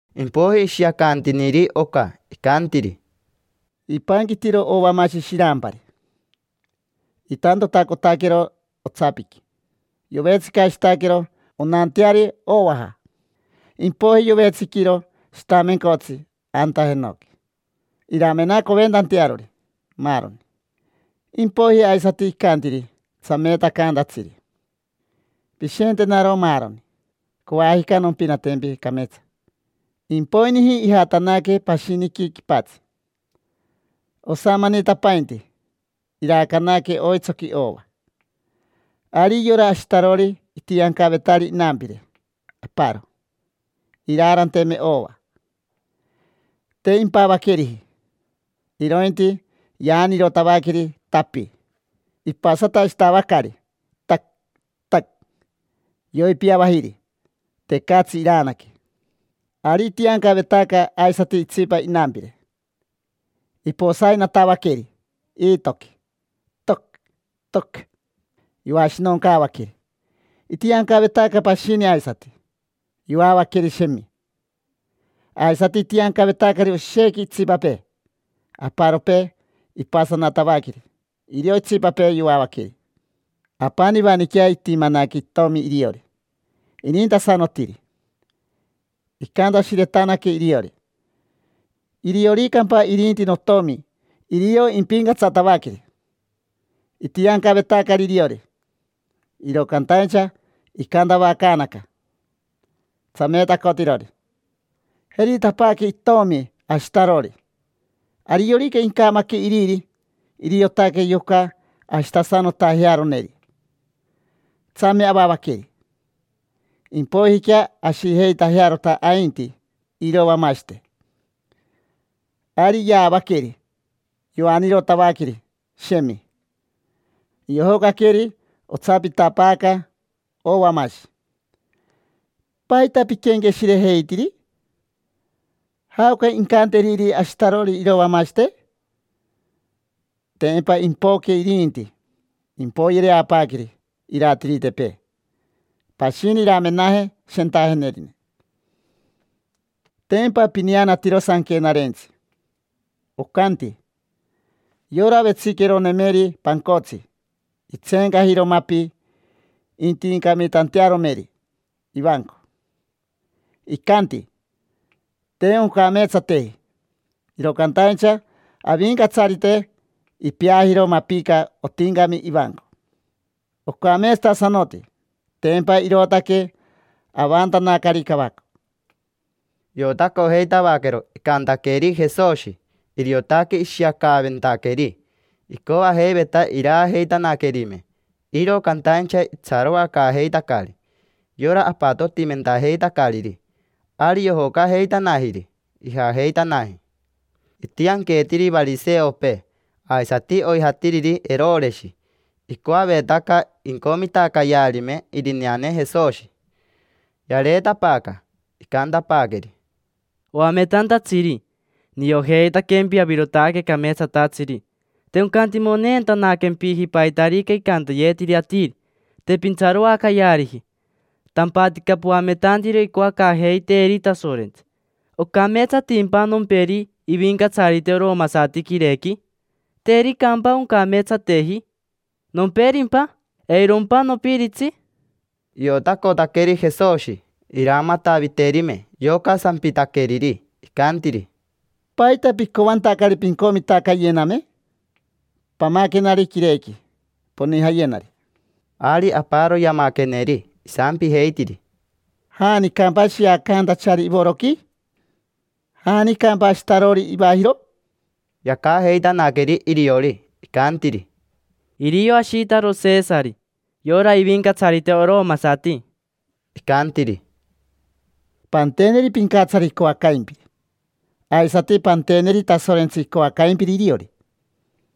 Impoiji ishiacantiniri oca, icantiri: —Ipanquitiro ovamashi shirampari. Itantotacotaquero otsapiqui, yovetsicashitaquero onanteari ovaja. Impoiji yovetsiquiro shitamencotsi anta jenoqui iramenacoventantearori maaroni. Impoiji aisati icantiri tsameetacantatsiri: “Pishentenaro maaroni: coajica nompinatempi cameetsa”. Impoiniji ijatanaque pashiniqui quipatsi. Osamanitapainti iraacanaque oitsoqui ova. Ari yora ashitarori itiancavetari inampire aparo, iraaranteme ova. Te impavaqueriji, irointi yaanirotavaqueri, tapi; ipasatashitavacari, tac, tac. Yoipiavajiri, tecatsi iraanaque. Ari itiancavetaca aisati itsipa inampire. Iposainatavaqueri iitoqui, toc, toc, yoashinoncaavaqueri. Itiancavetaca pashini aisati. Yoavaqueri, shemi. Aisati itiancavetacari oshequi itsipapee: aparopee ipasanatavaqueri, irio itsipapee yoavaqueri. Apanivaniquea itimanaque itomi iriori, inintasanotiri. Icantashiretanaque iriori: “Irioricampa irinti notomi irio impincatsatavaqueri”. Itiancavetacari iriori. Iro cantaincha icantavacaanaca tsameetacotirori: “Jeritapaaque itomi ashitarori, ariorica incamaque iriri, iriotaque yoca ashitasanotajearoneri. Tsame avavaqueri, impoijiquea ashijeitajearota ainti irovamashite”. Ari yaavaqueri, yoanirotavaqueri, shemi. Yojocaqueri otsapitapaaca ovamashi. ¿Paita piquenqueshirejeitiri? ¿Jaoca incanteriri ashitarori irovamashite? Tempa impoque irinti, impoyereapaaqueri iratiritepee. Pashini iramenaje shentajenerine. Tempa pineanatiro sanquenarentsi. Ocanti: “Yora vetsiqueronemeri pancotsi itseencajiro mapi intincamitantearomeri ivanco, icanti: ‘Te oncameetsateji’. Iro cantaincha Avincatsarite ipeajiro mapica otincami ivanco, ocameetsatasanoti. Tempa irootaque avantanacari cavaco”. Iotacojeitavaquero icantaqueri Jesoshi, iriotaque ishiacaaventaqueri. Icoajeiveta iraajeitanaquerime, iro cantaincha itsaroacaajeitacari yora apatotimentajeitacariri. Ari yojocajeitanajiri, ijajeitanaji. Itianqueetiri variseopee aisati oijatiriri Eroreshi. Icoavetaca incomitacayearime irineane Jesoshi. Yareetapaaca, icantapaaqueri: —Oametantatsiri, niojeitaquempi avirotaque cameetsatatsiri. Te oncantimoneentanaquempiji paitarica icantayetiri atiri, te pintsaroacayeariji. Tampatica poametantiro icoacaajeiteeri Tasorentsi. ¿Ocameetsatimpa nomperi ivincatsarite oromasati quirequi? ¿Tericampa oncameetsateji? ¿Nomperimpa? ¿Eirompa nopiritsi? Iotacotaqueri Jesoshi, iramataviterime yoca sampitaqueriri. Icantiri: —¿Paita picoantacari pincomitacayename? Pamaquenari quirequi, ponijayenari. Ari aparo yamaqueneri. Isampijeitiri: —¿Janicampa shiacantachari ivoroqui? ¿Janicampa ashitarori ivajiro? Yacajeitanaqueri iriori, icantiri: —Irio ashitaro Shisari, yora ivincatsarite oromasati. Icantiri: —Panteneri pincatsari icoacaimpiri, aisati panteneri Tasorentsi icoacaimpiri iriori.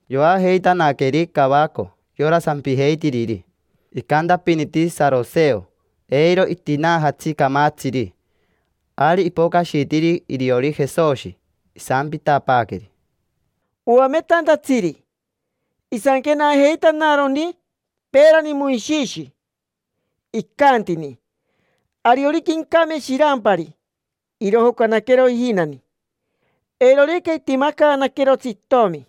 Yoajeitanaqueri cavaco yora sampijeitiriri. Icantapiniti saroseo: “Eiro itinaajatsi camatsiri”. Ari ipocashitiri iriori Jesoshi, isampitapaaqueri: —Oametantatsiri, isanquenajeitanaroni peerani Moishishi, icantini: “Ariorica incame shirampari, irojocanaquero ijinani. Eirorica itimacaanaquerotsi itomi,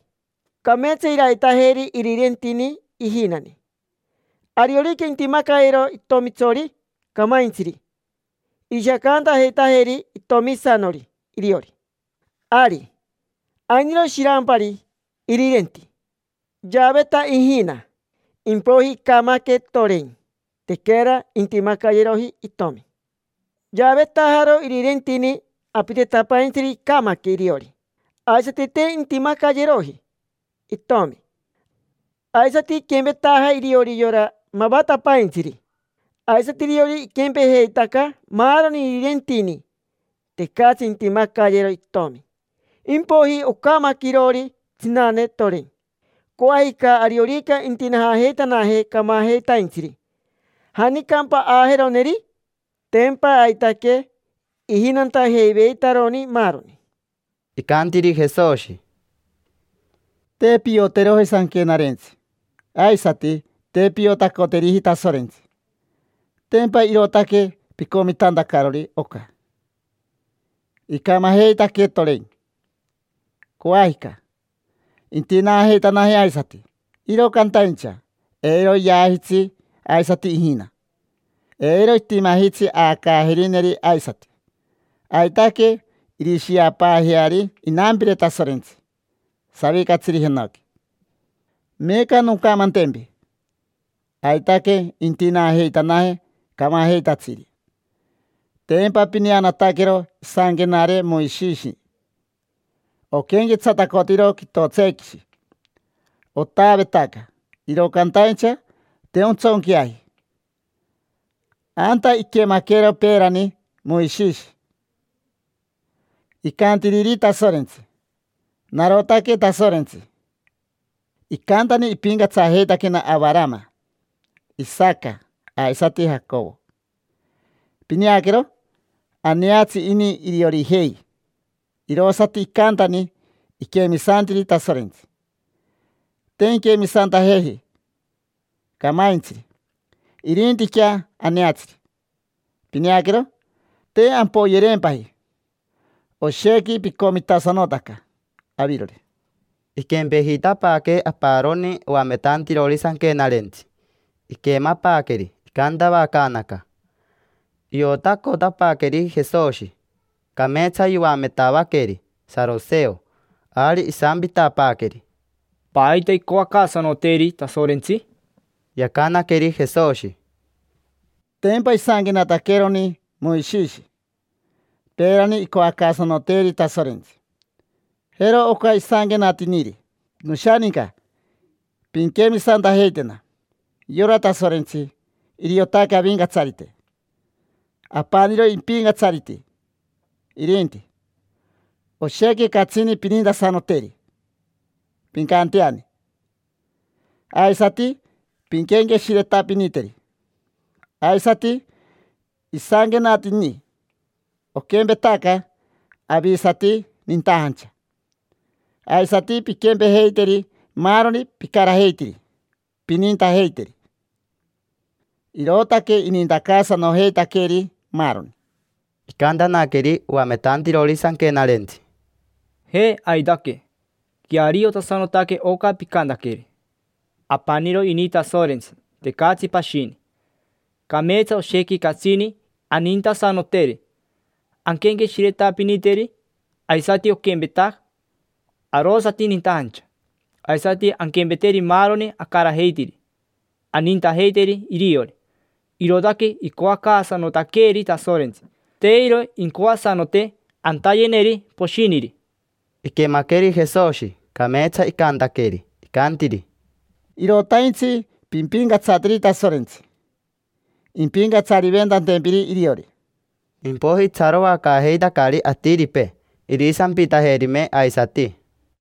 cameetsa iraitajeri irirentini ijinani. Ariorica intimacayero itomitsori camaintsiri, irishiacantajeitajeri itomisanori iriori”. Ari. Ainiro shirampari irirenti. Yaaveta ijina, impoiji icamaque, toren. Tequera intimacayeroji itomi. Yaavetajaro irirentini apitetapaintsiri. Icamaque iriori, aisati te intimacayeroji itomi. Aisati iquempetaja iriori yora mavatapaintsiri. Aisati iriori iquempejeitaca maaroni irirentini. Tecatsi intimacayero itomi. Impoiji ocamaque iroori tsinane, toren. Coajica ariorica intinaajeitanaje camajeitaintsiri, ¿janicampa aajeroneri? Tempa aitaque ijinantajeiveitaroni maaroni. Icantiri Jesoshi: —Te pioteroji sanquenarentsi, aisati te piotacoteriji Tasorentsi, tempa irootaque picomitantacarori oca. Icamajeitaque, toren. Coajica intinaajeitanaje aisati. Iro cantaincha eiro yaajitsi aisati ijina. Eiro itimajitsi aacaajerineri aisati. Aitaque irishiapaajeari inampire Tasorentsi savicatsiri jenoqui. Meeca noncamantempi: aitaque intinaajeitanaje camajeitatsiri. Tempa pineanataquero isanquenare Moishishi. Oquenquetsatacotiro quitotsequishi, otaavetaca iro cantaincha te ontsonqueaji. Anta iquemaquero peerani Moishishi icantiriri Tasorentsi: “Narotaque Tasorentsi, icantani ipincatsajeitaquena Avarama, Isaca, aisati Jacovo”. Pineaquero, aneatsi ini iriorijei, irosati icantani iquemisantiri Tasorentsi. Te inquemisantajeji camaintsiri, irintiquea aneatsiri. Pineaquero, te ampoyereempaji. Oshequi picomitasanotaca avirori. Iquempejitapaaque aparoni oametantirori sanquenarentsi. Iquemapaaqueri icantavacaanaca. Iotacotapaaqueri Jesoshi, cameetsa yoametavaqueri saroseo. Ari isampitapaaqueri: —¿Paita icoacaasanoteeri Tasorentsi? Yacanaqueri Jesoshi: —Tempa isanquenataqueeroni Moishishi peerani icoacaasanoteeri Tasorentsi. Jero oca isanquenatiniri: “Noshaninca, pinquemisantajeitena. Yora Tasorentsi, iriotaque Avincatsarite, apaniro ipincatsariti irinti. Oshequi catsini pinintasanoteri, pincanteani. Aisati pinquenqueshiretapiniteri”. Aisati isanquenatini: “Oquempetaca avisati nintajancha, aisati pinquempejeiteri maaroni picarajeitiri, pinintajeiteri”. Irootaque inintacaasanojeitaqueeri maaroni. Icantanaqueri oametantirori sanquenarentsi: —Je, aitaque. Queariotasanotaque oca picantaqueri. Apaniro ini Tasorentsi, tecatsi pashini. Cameetsa oshequi catsini anintasanoteri, anquenqueshiretapiniteri. Aisati oquempeta arosati nintajancha, aisati anquempeteri maaroni acarajeitiri, anintajeiteri iriori. Irootaque icoacaasanotaqueeri Tasorentsi. Te iro incoasanote atayeneri poshiniri. Iquemaqueri Jesoshi, cameetsa icantaqueri, icantiri: —Irotaintsi pimpincatsateri Tasorentsi, impincatsariventantempiri iriori. Impoiji itsaroacaajeitacari atiripee irisampitajerime aisati.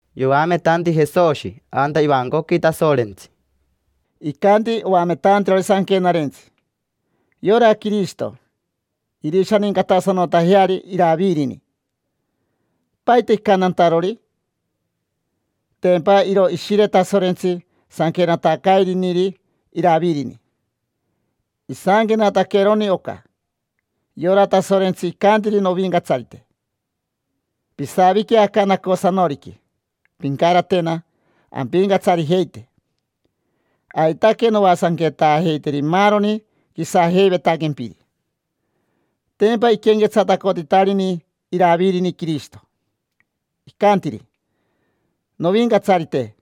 Yoametanti Jesoshi anta ivancoqui Tasorentsi: —Icanti oametantirori sanquenarentsi: “Yora Quirishito, irishanincatasanotajeari Iravirini”. ¿Paita icantantarori? Tempa iro Ishire Tasorentsi sanquenatacairiniri Iravirini. Isanquenataqueroni oca: “Yora Tasorentsi icantiri novincatsarite: ‘Pisavique aca nacosanoriqui, pincaratena ampincatsarijeite. Aitaque noasanquetaajeiteri maaroni quisajeivetaquempiri’”. Tempa iquenquetsatacotitarini Iravirini Quirishito, icantiri: “Novincatsarite”.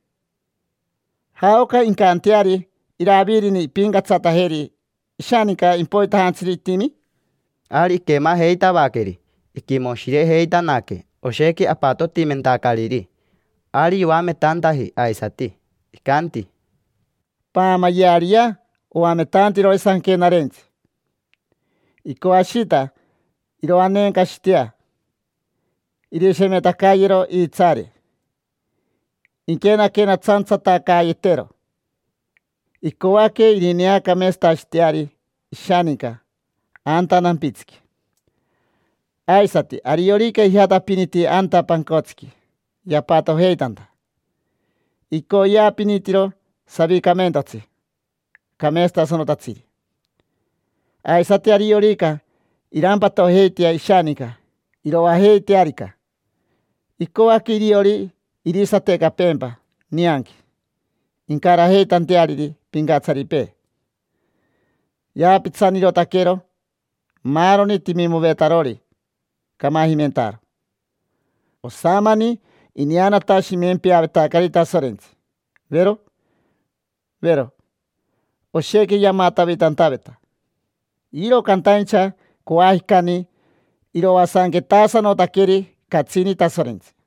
¿Jaoca incanteari Iravirini impincatsatajeri ishaninca impoitajantsiri itimi? Ari iquemajeitavaqueri, iquimoshirejeitanaque oshequi apatotimentacariri. Ari yoametantaji aisati, icanti: —Paamayeariyea oametantirori sanquenarentsi. Icoashita iroaneencashitea, irishemetacayero iitsaare, inquenaquenatsantsatacaayetero. Icoaque irineacameetsatashiteari ishaninca anta nampitsiqui. Aisati ariorica ijatapiniti anta pancotsiqui yapatojeitanta, icoyeapinitiro savicamentotsi cameetsatasanotatsiri. Aisati ariorica irampatojeitea ishaninca iroajeitearica, icoaque iriori irisatecapeempa nianqui incarajeitanteariri pincatsaripee. Yaapitsanirotaquero maaroni timimovetarori camajimentaaro. Osamani ineanatashimempeavetacari Tasorentsi, vero, vero. Oshequi yamatavitantaveta, iro cantaincha coajicani iroasanquetasanotaqueri catsini Tasorentsi.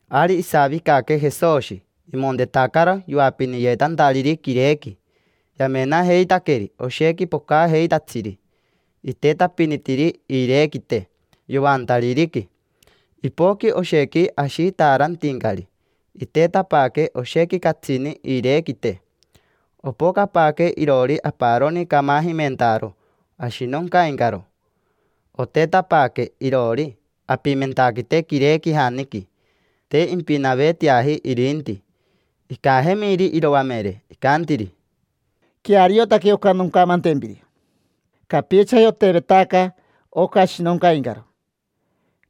Ari isavicaque Jesoshi, imontetacaro yoapiniyetantariri quirequi. Yamenajeitaqueri oshequi pocajeitatsiri, itetapinitiri iirequite yoantaririqui. Ipoqui oshequi ashitaarantincari, itetapaaque oshequi catsini iirequite. Opocapaaque iroori aparoni camajimentaaro ashinoncaincaro. Otetapaaque iroori apimentaquite quirequijaniqui, te impinaveteaji irinti. Icajemiri iroamere, icantiri: —Queariotaque oca noncamantempiri: capichaji otevetaca oca ashinoncaincaro,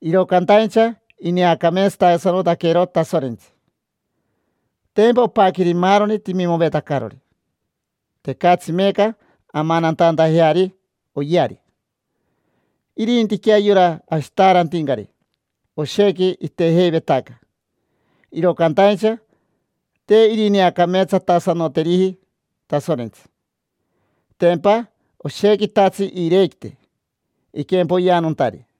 iro cantaincha ineacameetsatasanotaquero Tasorentsi. Tempa opaqueri maaroni timimovetacarori: tecatsi meeca amanantantajeari oyeari. Irintiquea yora ashitaarantincari, oshequi itejeivetaca, iro cantaincha te irineacameetsatasanoteriji Tasorentsi: tempa oshequitatsi iirequite iquempoyeanontari.